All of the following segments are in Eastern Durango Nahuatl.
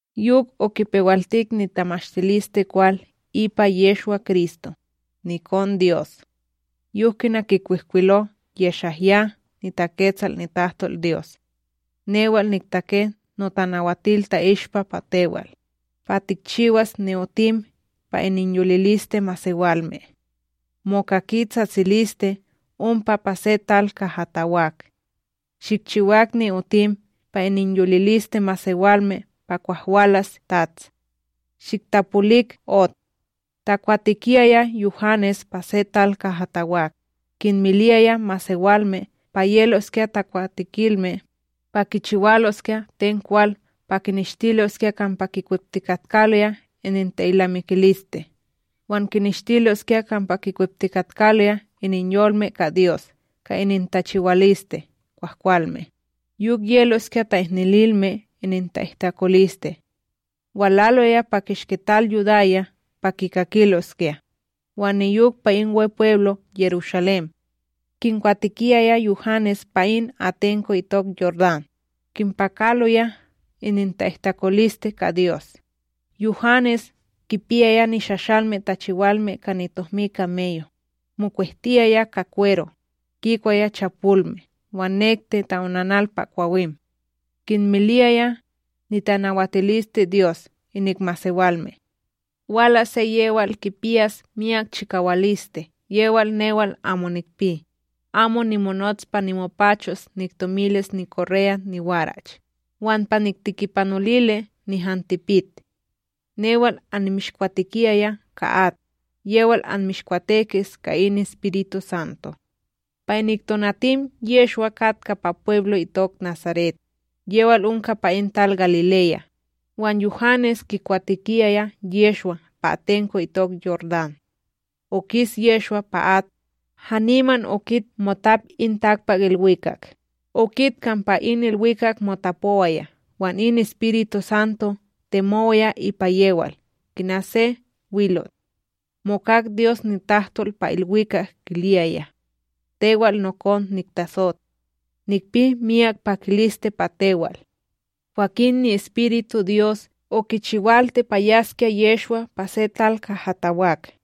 Yok okipewaltik nitamashtilisteKwal ipa Yehshwa-Kristo, nikonDyos. Yok kina kikwihkwilo YeshaYah niTaketsal nitahtolDyos: Newal niktake notanawatil ta'ishpa pa tewal, pa tikchiwas ni'otim pa ininyoliliste masewalme. Mokaki tsatsiliste ompa pa se tal kaha tawak: “Shikchiwak ni'otim pa ininyoliliste masewalme pa kwah walas TATS.a Shiktapolik ot.” Takwatekiyaya Yuhanes pa se tal kaha tawak, kinmiliyaya masewalme pa yeloskya takwatekilme, pa kichiwaloskya ten kwal pa kineshtiloskya kampa kikweptikatkaloya ininta’ilnamikiliste wan kineshtiloskya kampa kikweptikatkaloya ininyolme ka Dyos ka inintachiwaliste kwahkwalme, yok yeloskya ta'ihnililme ininta'ihtakoliste. Walaloya pa kishki tal Yudaya pa kikakiloskya, wan niyok pa in Wepweblo Yerushalém; kinkwatekiyaya Yuhanes pa in atenko itok Yordán, kinpakaloya ininta'ihtakoliste ka Dyos. Yuhanes kipiyaya nishashalme tachiwalme ka nitohmi kameyo, mokwehtiyaya ka kwero, kikwaya chapolme wan nekti ta'onanal pa kwawim. Kinmiliyaya, nitanawatilisteDyos inik masewalme: ―Walas se yewal kipiyas miyak chikawaliste yewal newal amo nikpi, amo nimonots pa nimopachos niktomilis nikorreya niwarach wan pa niktikipanolili nihan tipit. Newal annimishkwatekiyaya ka at; yewal anmishkwatekis ka in EspirituSanto. Pa inik tonatim Yehshwa katka pa pweblo itok Nasaret, yewal onka pa in tal Galileya, wan Yuhanes kikwatekiyaya Yehshwa pa atenko itok Yordán. Okis Yehshwa pa at, haniman okit motap in takpakIlwikak, okit kampa in ilwikak motapowaya wan in EspirituSanto temowaya ipa yewal kina se wilot. Mokak Dyos nitahtol pa ilwikak kiliyaya: ―Tewal nokon niktasot; nikpi miyak pakiliste pa tewal. Kwakin niEspirituDyos okichiwalti pa yaskya Yehshwa pa se tal kaha tawak.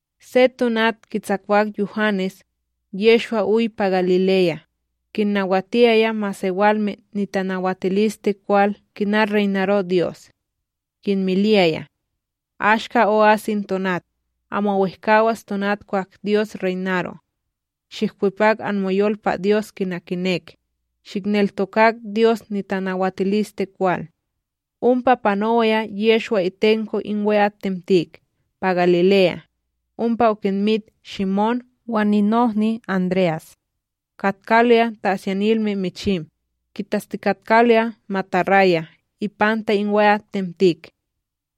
Se tonat kitsakwak Yuhanes, Yehshwa oy pa Galileya, kinnawatiyaya masewalme nitamashtilisteKwal kina reynaro Dyos. Kinmiliyaya: ―Ashka o'as in tonat, amo wehkawas tonat kwah Dyos reynaro. Shihkwepak anmoyol pa Dyos kina kinek, shihneltokak Dyos nitamashtilisteKwal. Ompa panowaya Yehshwa itenko in we'atTemtik pa Galileya, ompa okinmit Shimón wan ninohni André'as. Katkaloya ta'asyanilme michim, kintastikatkaloya mataraya ipanta we'atTemtik.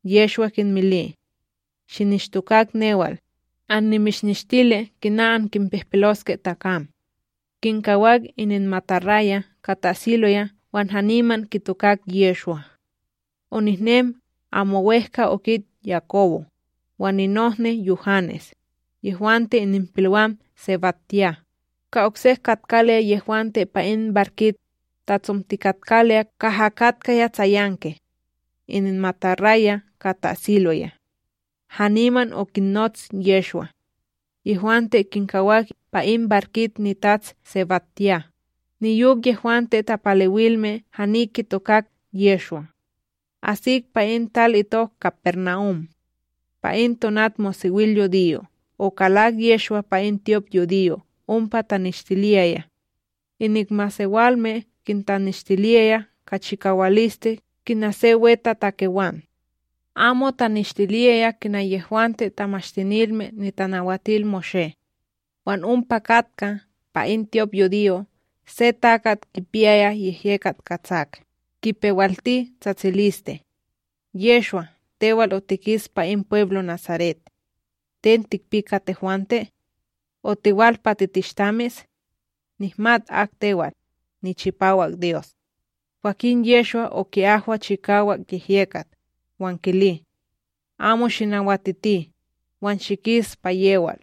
Yehshwa kinmili: ―Shinishtokak newal, annimishnishtili kina ankinpihpiloske takam. Kinkawak ininmataraya' ka ta'asiloya wan haniman kitokak Yehshwa. Onehnem amo wEhka okit Yakobo, wan ninohni Yuhanes, yehwante ininpilwam SebadYah, ka oksek katkaloya yehwante pa in barkit tatsomtikatkaloya kaha katkaya tsayanki ininmataraya ka ta'asiloya. Haniman okinnots Yehshwa; yehwante kinkawak pa in barkit nitats SebadYah niyok yehwante tapalewilme hani kitokak Yehshwa. Asik pa tal itok KaparNahum; pa in tonatmosewilyudiyo okalak Yehshwa pa in tyopYudiyo ompa taneshtiliyaya. Inik masewalme kintaneshtiliyaya ka chikawaliste kina se wetatakewan, amo taneshtiliyaya kina yehwante Tamashtinilme NitanawatilMoshé. Wan ompa katka pa in tyopYudiyo se takat kipiyaya yehyekat katsak, kipewalti tsatsiliste: ―Yehshwa tewal otikis pa in pweblo Nasaret! Ten tikpi ka tehwante? Otiwal pa titishtamis? Nihmat ak tewal, niChipawak Dyos. Kwakin Yehshwa oki'ahwa chikawak yehyekat, wan kili: ―Amo shinawatiti, wan shikis pa yewal!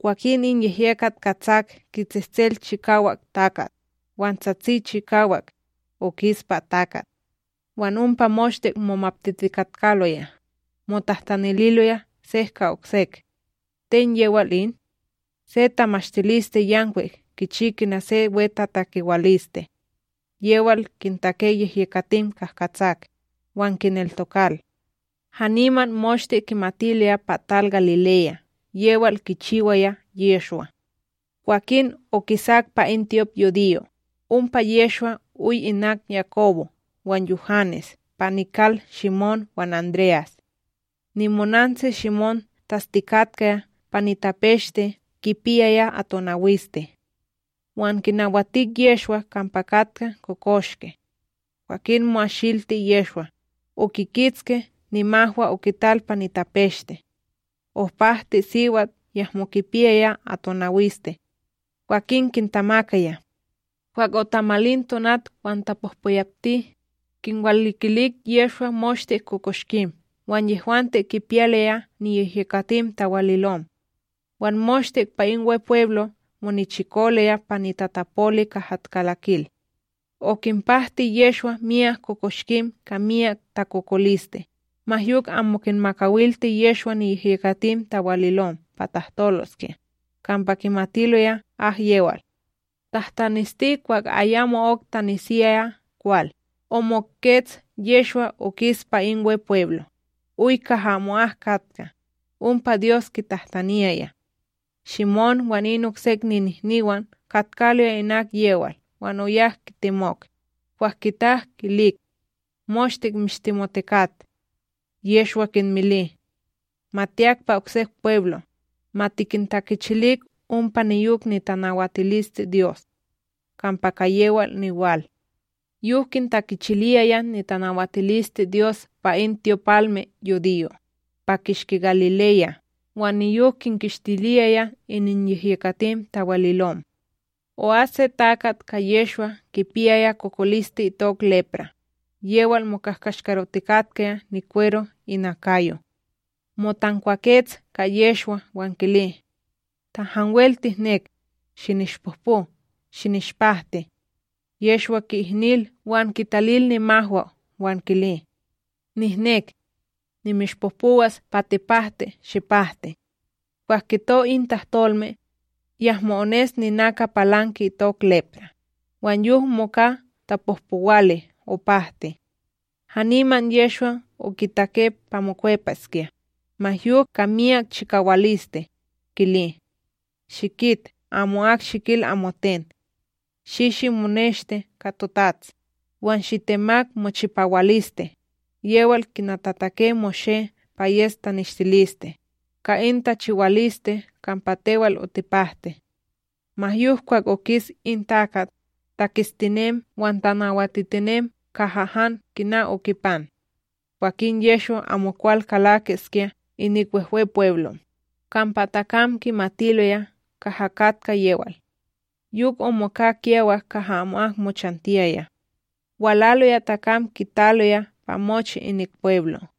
Kwakin in yehyekat katsak kitsehsel chikawak takat, wan tsatsi chikawak, okis pa takat. Wan ompa moshte momaptitikatkaloya, motahtanililoya sek ka oksek: ―Ten yewal in? Se tamashtiliste yankwik kichi kina se wetatakewaliste! Yewal kintake yehyekatim kahkatsak, wan kineltokal! Haniman moshte kimatiloya pa tal Galileya yewal kichiwaya Yehshwa. Kwah okisak pa in tyopYudiyo, ompa Yehshwa oy inak Yakobo wan Yuhanes pa nikal Shimón wan André'as. Nimonantsi Shimón tastikatka pa nitapeshte kipiyaya atonawiste; wan kinawatik Yehshwa kampa katka kokoshke. Kwakin mo'ashilti Yehshwa, okikitski nimahwa okital pa nitapeshte; opahti siwat yahmo kipiyaya atonawiste, kwakin kintamakaya. Kwah otamalin tonat wan tapohpoyapti, kinwalikilik Yehshwa moshte kokoshkim wan yehwante kipiyaloya niyehyekatim tawalilom; wan moshte pa in Wepweblo monichikoloya pa nitatapoli kaha kalakil. Okinpahti Yehshwa myak kokoshkim ka myak takokoliste, ma yok amo kinmakawalti Yehshwa niyehyekatim tawalilom pa tahtoloskya, kampa kimatiloya akyewal. Tahtanesti, kwah ayamo'ok tanesiyaya kwal, omokets Yehshwa okis pa in Wepweblo, oy kaha amo'ak katka, ompa Dyos kitahtaniyaya. Shimón wan in oksek ninihniwan katkaloya inak yewal wan oyak kitemok, kwah kitak kilik: ―Moshte mishtemotikat. Yehshwa kinmili: ―Ma tiyak pa oksek pweblo', ma tikintakichilik ompa niyok nitanawatilisteDyos: Kampa ka yewal niwal. Yok kintakichiliyaya nitanawatilisteDyos pa in tyopalmeYudiyo', pa kishki Galileya, wan niyok kinkishtiliyaya ininyehyekatim tawalilom. O'as se takat ka Yehshwa kipiyaya kokoliste itok lepra,b yewal mokahkashkarotikatka nikwero inakayo. Motankwakets ka Yehshwa wan kili: ―Ta hanwel tihnek, shinishpohpo shinishpahti. Yehshwa ki'ihnil, wan kitalil nimahwa, wan kili: ―Nihnek. Nimishpohpowas pa tipahti shipahti. Kwah kito in tahtolme, yahmo ones ninaka palanki itok lepra, wan yok moka tapohpowali opahti. Haniman Yehshwa okitake pa mokwepaskya, ma yok ka miyak chikawaliste, kili: ―Shikit, amo'ak shikil amoten; shi shimoneshti ka totats, wan shitemak mochipawaliste, yewal kina tatake Moshé pa yes taneshtiliste, ka in tachiwaliste kampa tewal otipahti. Ma yok kwah okis in takat, taketstinem wan tanawatitinem kaha han kina okipan. Kwakin Yehshwa amokwal kalakiskya inik Wehwepweblo', kampa takam kimatiloya kaha katka yewal. Yok omoka kiyawak kaha amo'ak mochantiyaya; walaloya takam kitaloya pa mochi inik pweblo'.